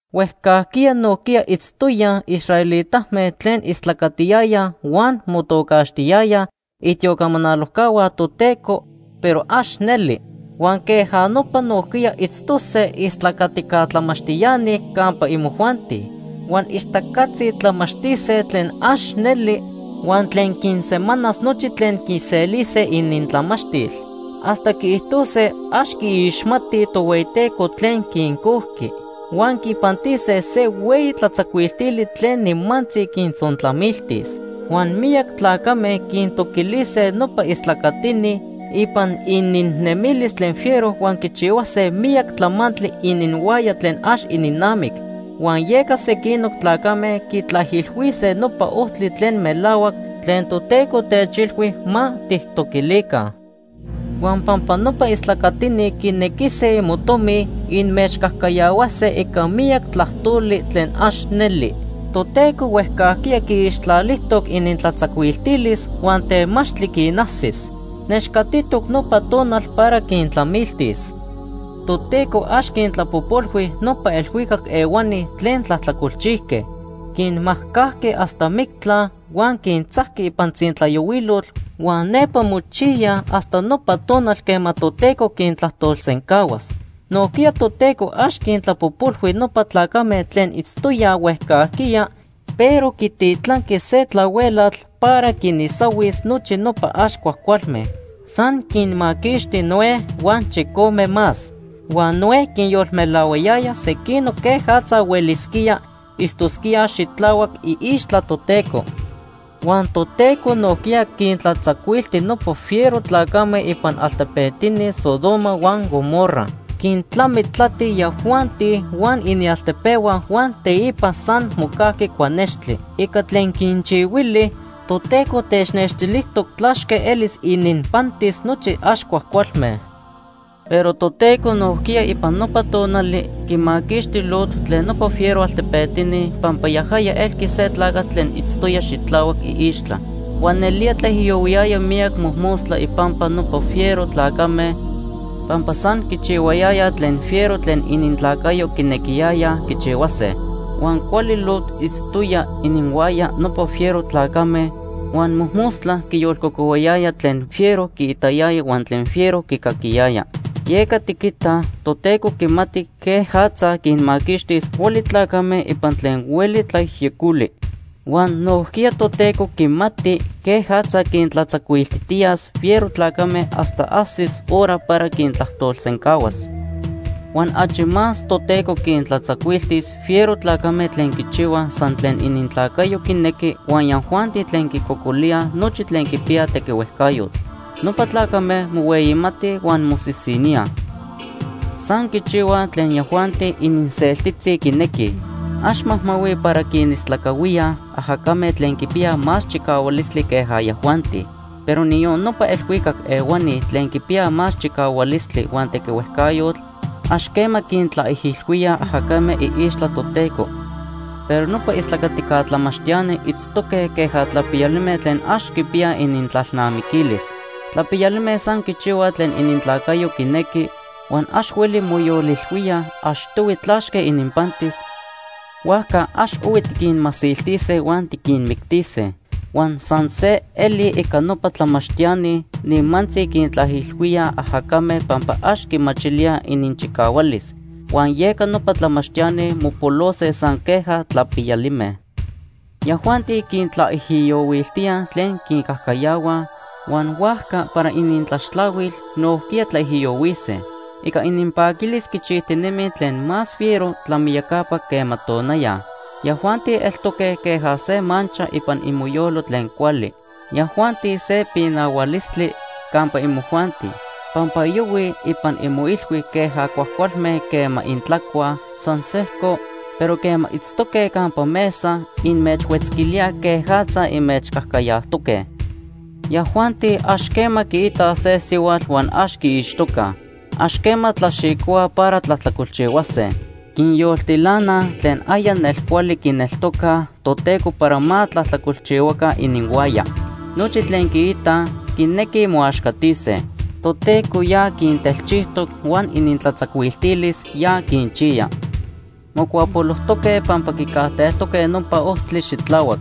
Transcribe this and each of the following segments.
Huejcajquiya nojquiya itztoyaj israelitame tlen istlacatiyayaj huan motocaxtiyayaj itiocamanalojcahua Toteco, pero ax neli. Huan queja nopa nojquiya itztose istlacatica tlamachtiani campa imojuanti. Huan ixtacatzi tlamachtise tlen ax neli huan tlen quinsemanas nochi tlen quiselise inintlamachtil. Hasta quiijtose ax quiixmatij Tohueyiteco tlen quincojqui. Huan quipantise se hueyi tlatzacuiltili tlen nimantzi quintzontlamiltis. Huan miyac tlacame quintoquilise nopa istlacatini ipan ininnemilis tlen fiero huan quichihuase miyac tlamantli ininhuaya tlen ax ininnamic. Huan yeca sequinoc tlacame quitlaijilhuise nopa ojtli tlen melahuac tlen Toteco techilhui ma tijtoquilica. Huan pampa nopa istlacatini quinequise imotomi, inmechcajcayahuase ica miyac tlajtoli tlen ax neli. Toteco huejcajquiya quiixtlalijtoc inintlatzacuiltilis huan temachtli quinajsis. Nechcatitoc nopa tonal para quintlamiltis. Toteco ax quintlapojpolhui nopa elhuicac ehuani tlen tlajtlacolchijque. Quinmajcajqui hasta mictla, huan quintzajqui ipan tzintlayohuilotl huan nepa mochiyaj hasta nopa tonal quema Toteco quintlajtolsencahuas. Nojquiya Toteco ax quintlapojpolhui nopa tlacame tlen itztoyaj huejcajquiya, pero quititlanqui se tlahuelatl para quinisahuis nochi nopa ax cuajcualme. San quinmaquixti Noé huan chicome más. Huan Noé quinyolmelahuayaya sequinoc quejatza huelisquíaj itztosquíaj xitlahuac iixtla Toteco. Huan Toteco nojquiya quintlatzacuilti nopa fiero tlacame ipan altepetini Sodoma huan Gomorra. Quintlamitlati yajuanti huan inialtepehua huan teipa san mocajqui cuanextli. Ica tlen quinchihuili, Toteco technextilijtoc tlachque elis ininpantis nochi ax cuajcualme. Pero Toteco nojquiya ipan nopa tonali quimaquixti Lot tlen nopa fiero altepetini pampa yajaya elqui se tlacatl tlen itztoya xitlahuac iixtla. Huan nelía tlaijiyohuiyaya miyac mojmostla ipampa nopa fiero tlacame pampa san quichihuayayaj tlen fiero tlen inintlacayo quinequiyayaj quichihuase. Huan cuali Lot itztoya ininhuaya nopa fiero tlacame, huan mojmostla quiyolcocohuayaya tlen fiero quiitayaya huan tlen fiero quicaquiyaya. Yeca tiquitaj Toteco quimati quejatza quinmaquixtis cuali tlacame ipan tlen hueli tlayejyecoli. Huan nojquiya Toteco quimati quejatza quintlatzacuiltijtiyas fiero tlacame hasta ajsis hora para quintlajtolsencahuas. Huan achi más Toteco quintlatzacuiltis fiero tlacame tlen quichihuaj san tlen inintlacayo quinequi huan yajuanti tlen quincocolíaj nochi tlen quipiyaj tequihuejcayotl. Nopa tlacame mohueyimatij huan mosisiníaj. San quichihuaj tlen yajuanti ininseltitzi quinequij. Ax majmahuij para quinistlacahuíaj ajacame tlen quipiyaj más chicahualistli queja yajuanti. Pero niyon nopa elhuicac ehuani tlen quipiyaj más chicahualistli huan tequihuejcayotl, ax quema quintlaijilhuíaj ajacame iixtla Toteco. Pero nopa istlacatica tlamachtiani itztoque queja tlapiyalime tlen ax quipiyaj inintlalnamiquilis. Tlapiyalime san quichihuaj tlen inintlacayo quinequi, huan ax hueli moyolilhuíaj achtohui tlachque ininpantis, huajca ax ohui tiquinmasiltise huan tiquinmictise. Huan san se eli ica nopa tlamachtiani, nimantzi quintlaijilhuíaj ajacame pampa ax quimachilíaj ininchicahualis. Huan yeca nopa tlamachtiani mopolose san queja tlapiyalime. Yajuanti quintlaijiyohuiltíaj tlen quincajcayahuaj, huan huajca para inintlaxtlahuil nojquiya tlaijiyohuise. Ica ininpaquilis quichijtinemij tlen más fiero tlamiyacapa quema tonaya. Yajuanti eltoque queja se mancha ipan imoyoyo tlen cuali. Yajuanti se pinahualistli campa imojuanti, pampa yohuij ipan imoilhui queja cuajcualme quema intlacuaj san sejco, pero quema itztoque campa mesa, inmechhuetzquilíaj quejatza inmechcajcayajtoque. Yajuanti ax quema quiitaj se sihuatl huan ax quiixtocaj. Ax quema tlaxicohuaj para tlajtlacolchihuase. Quinyoltilanaj tlen aya nelcuali quineltocaj Toteco para ma tlajtlacolchihuaca ininhuaya. Nochi tlen quiitaj, quinequij moaxcatise. Toteco ya quintelchijtoc huan inintlatzacuiltilis ya quinchiya. Mocuapolojtoque pampa quicajtejtoque nopa ojtli xitlahuac.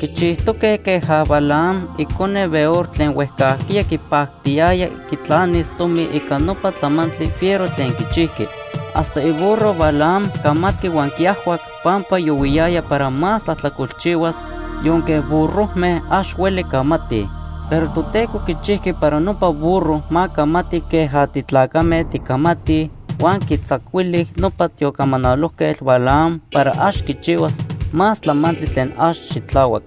Quichijtoque queja Balaam icone Beor tlen huejcajquiya quipactiyaya quitlanis tomi ica nopa tlamantli fiero tlen quichijqui. Hasta iburro Balaam camatqui huan quiajhuac pampa yohuiyaya para más tlajtlacolchihuas, yonque burrojme ax hueli camatij. Pero Toteco quichijqui para nopa burro ma camati queja titlacame ticamatij, huan quitzacuili nopa tiocamanalojquetl Balaam para ax quichihuas más tlamantli tlen ax xitlahuac.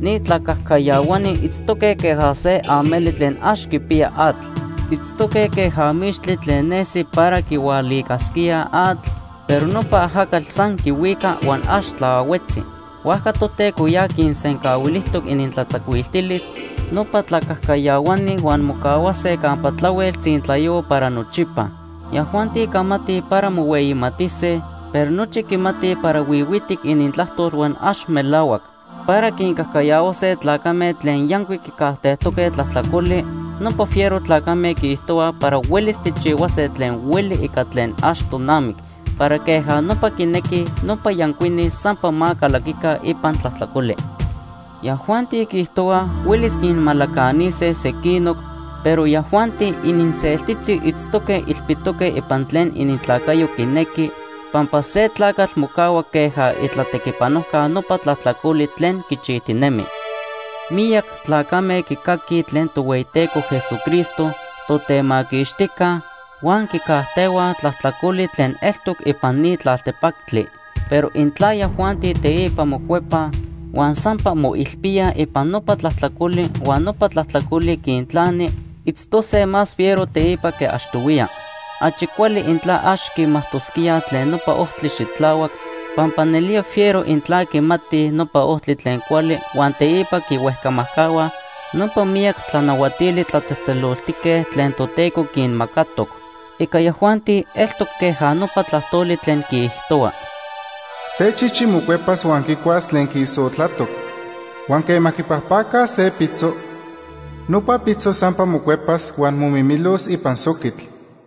Ni tlacajcayahuani itztoque queja se ameli tlen ax quipiya atl. Itztoque queja mixtli tlen nesi para quihualicasquía atl, pero nopa ajacatl san quihuica huan ax tlaahuetzi. Huajca Toteco ya quinsencahuilijtoc inintlatzacuiltilis nopa tlacajcayahuani huan mocahuase campa tlahuel tzintlayohua para nochipa. Yajuanti camatij para mohueyimatise, pero nochi quimatij para huihuitic inintlajtol huan ax melahuac. Para quincajcayahuase tlacame tlen yancuic quicajtejtoque tlajtlacoli, nopa fiero tlacame quiijtohuaj para huelis tijchihuase tlen hueli ica tlen ax tonamic para queja nopa quinequij nopa yancuini sampa ma calaquica ipan tlajtlacoli. Yajuanti quiijtohuaj huelis quinmalacanise sequinoc, pero yajuanti ininseltitzi itztoque ilpitoque ipan tlen inintlacayo quinequi, pampa se tlacatl mocahua queja itlatequipanojca nopa tlajtlacoli tlen quichijtinemi. Miyac tlacame quicaquij tlen Tohueyiteco Jesucristo, Totemaquixtijca, huan quicajtehuaj tlajtlacoli tlen eltoc ipan ni tlaltepactli. Pero intla yajuanti teipa mocuepaj huan sampa moilpíaj ipan nopa tlajtlacoli huan nopa tlajtlacoli quintlani, itztose más fiero teipa que achtohuiya. Achi cuali intla ax quimajtosquíaj tlen nopa ojtli xitlahuac, pampa nelía fiero intla quimatij nopa ojtli tlen cuali huan teipa quinhuejcamajcahuaj nopa miyac tlanahuatili tlatzejtzeloltique tlen Toteco quinmacatoc. Ica yajuanti eltoc queja nopa tlajtoli tlen quiijtohua: “Se chichi mocuepas huan quicuas tlen quiisotlatoc. Huan quema quipajpacaj se pitzo, nopa pitzo sampa mocuepas huan momimilos ipan soquitl.”